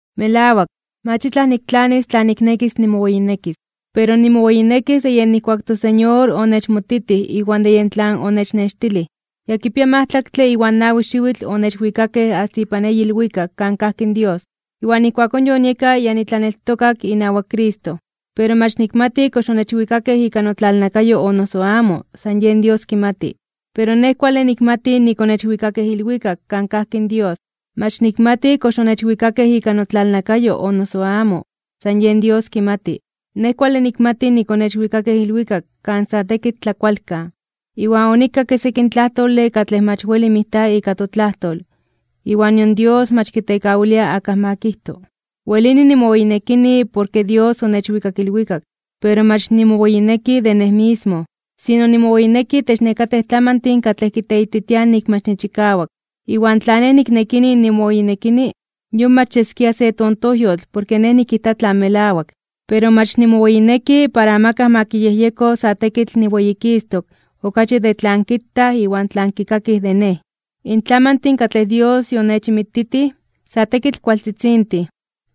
Melawak, mach itlaj niktlanis tla niknekis nimoweyinekis. Pero nimoweyinekis de yej nijkuak in toSeñor onechmoititij iwan de yen tlan onechnextilij. Ya kipia majtlaktle iwan nawi xiwitl onechwikakej asta ipan eyi ilwikak kan kajki in Dios, iwan ijkuakón yonieka ya nitlaneltokak inawak Cristo. Pero mach nikmati kox onechwikakej ika notlalnakayo o noso amo, san yen Dios kimati. Pero nej kuale nikmati nik onechwikakej ilwikak kan kajki in Dios. Mach nikmati kox onechwikakej ika notlalnakayo o noso amo, san yen Dios kimati. Nej kuale nikmati nik onechwikakej ilwikak kan sa tekitl tlakualkan, iwan onikakke sekin tlajtole katlej mach weli mijta ika totlajtol iwan nion Dios mach kitekawilia akaj ma kijto. Welini nimoweyinekini porke Dios onechwikak ilwikak, pero mach nimoweyineki de nej mismo, sino nimoweyineki itech nekatej tlamantin katlej kiteititiaj nik mach nichikawak. Iwan tla nej niknekini nimoweyinekini, yon mach yeskia se tontojyotl porke nej nikijta tlan melawak. Pero mach nimoweyineki para amakaj ma kiyejyeko sa tekitl niweyikistok (niweyititok) okachi de tlan kitaj iwan de tlan kikakij de nej. In tlamantin katlej Dios yonechinmititij, sa tekitl kualtzitzintin,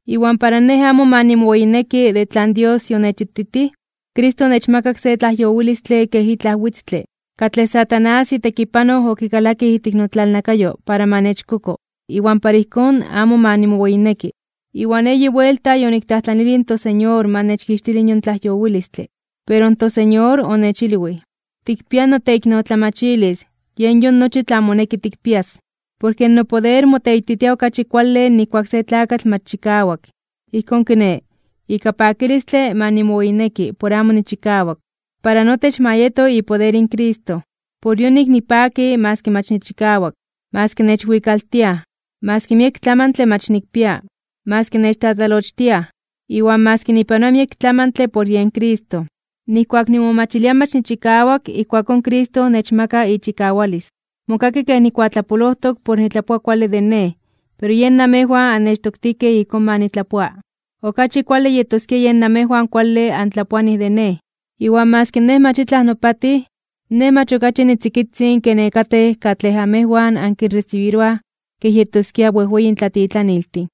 iwan para nej amo ma nimoweyineki de tlan Dios yonechititij, Cristo onechmakak se tlajyowilistle kej itlaj witztle, katlej Satanás itekipanoj okikalakij ijtik notlalnakayo para ma nechkoko, iwan para ijkón amo ma nimoweyineki. Iwan eyi buelta yoniktlajtlanilij in toSeñor ma nechkixtili yon tlajyowilistle. Pero in toSeñor onechilwij: “Tikpia noteiknotlamachilis, yen yon nochi tlan moneki tikpias. Porke nopoder moteititia okachi kuale nijkuak se tlakatl mach chikawak.” Ijkón kiné, ika pakilistle ma nimoweyineki por amo nichikawak, para notech ma yeto ipoder in Cristo. Por yonik nipaki maski mach nichikawak, maski nechwikaltiaj, maski miek tlamantle mach nikpia, maski nechtlatlalochtiaj, iwan maski nipanoa miek tlamantle por yen Cristo. Nijkuak nimomachilia mach nichikawak, ijkuakón Cristo nechmaka ichikawalis. Mokaki kej nikuatlapolojtok por nitlapoa kuale de nej, pero yen namejwan annechtoktijkej ijkón ma nitlapoa. Okachi kuale yetoskia yen namejwan kuale antlapoanij de nej, iwan maski nej mach itlaj nopatij, nej mach okachi nitzikitzin ke nekatej katlej amejwan ankinresibiroaj kej yetoskia wejweyin tlatitlaniltin.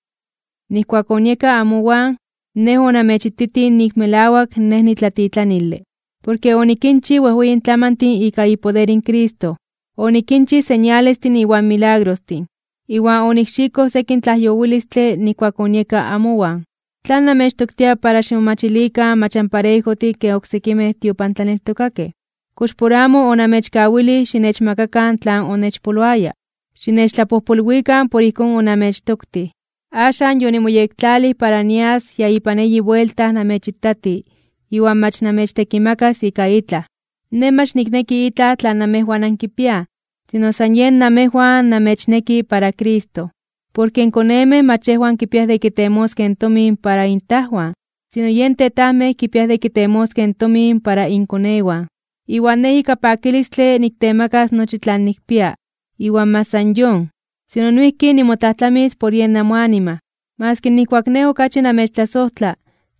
Nijkuak onieka amowan, nej onamechititij nik melawak nej nitlatitlanile. Porke onikinchij wejweyin tlamantin ika ipoder in Cristo, onikinchij señalestin iwan milagrostin, iwan onikxikoj sekin tlajyowilistle nijkuak onieka amowan. ¿Tlan namechtoktia para ximomachilikan mach anparejojtin ken oksekimej tiopantlaneltokakej? ¿Kox por amo onamechkawilij xinechmakakan tlan onechpoloaya? Xinechtlapojpolwikan por ijkón onamechtoktij. Axan yonimoyektlalij para nias ya ipan eyi buelta namechitati iwan mach namechtekimakas ika itlaj. Nej mach nikneki itlaj tlan amejwan ankipiaj, sino san yen namejwan namechneki para Cristo. Porke in konemej mach yejwan kipiaj de kitemoskej tomin para intajwan, sino yen tetajmej kipiaj de kitemoskej in tomin para inkonewan. Iwan nej ika pakilistle niktemakas nochi tlan nikpia, iwan mach san yon, sino noijki nimotlajtlamis por yen namoanima. Maski nijkuak nej okachi namechtlasojtla,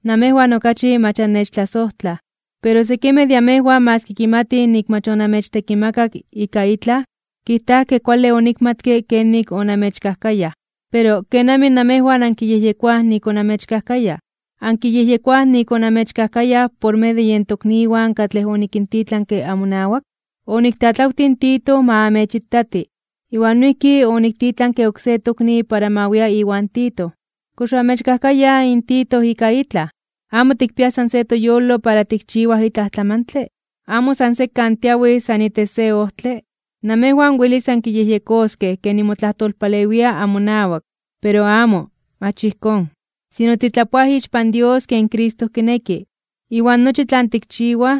namejwan okachi mach annechtlasojtlaj. Pero sekimej de amejwan maski kimatij nik mach onamechtekimakak ika itlaj, kijtaj ke kuale onikmatke kenik onamechkajkayaj. Pero, ¿kenamij namejwan ankiyejyekoaj nik onamechkajkayaj? ¿Akinyejyekoaj nik onamechkajkayaj por medio de yen tokniwan katlej onikintitlanke amonawak? Oniktlatlawtij in Tito ma amechitati, iwan noijki oniktitlanke oksé tokni para ma wia iwan Tito. ¿Kox oamechkajkayaj in Tito ika itlaj? ¿Amo tikpiaj san se toyolo para tikchiwaj itlaj tlamantle? ¿Amo san sekan tiawij san itech se ojtle? Namejwan welis ankiyejyekoskej ke timotlajtolpalewiaj amonawak. Pero amo, mach ijkón. Sino titlapoaj ixpan Dios ken Cristo kineki. Iwan nochi tlan tikchiwaj,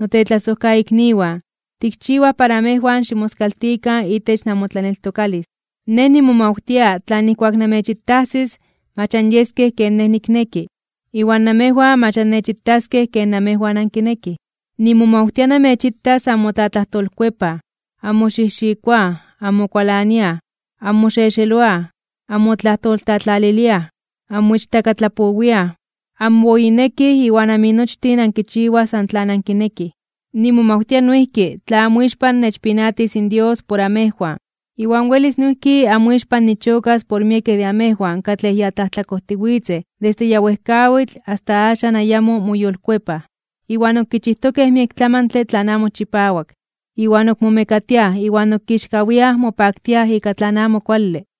notetlasojkaikniwan, tikchiwaj para amejwan ximoskaltikan itech namotlaneltokalis. Nej nimomawtia tla nijkuak namechitajsis, mach anyeskej ken nej nikneki, iwan namejwan mach annechitaskej ken amejwan ankinekij. Nimomawtia namechitas anmotlatlajtolkuepaj, anmoxijxikoaj, anmokualaniaj, anmoxexeloaj, anmotlajtoltlatlaliliaj, anmoichtakatlapowiaj, anmoweyinekij iwan aminochtin ankichiwaj san tlan ankinekij. Nimomawtia noijki, tla amoixpan nechpinatis in Dios por amejwan, iwan welis noijki amoixpan nichokas porke miekej de amejwan katlej ya tlajtlakojtiwitzej desde ya wejkawitl asta axan ayamo moyolkuepaj, iwan ok kichijtokej miek tlamantle tlan amo chipawak, iwan ok momekatiaj iwan ok kixkawiaj (momeliaj) mopaktiaj ika tlan amo kuale.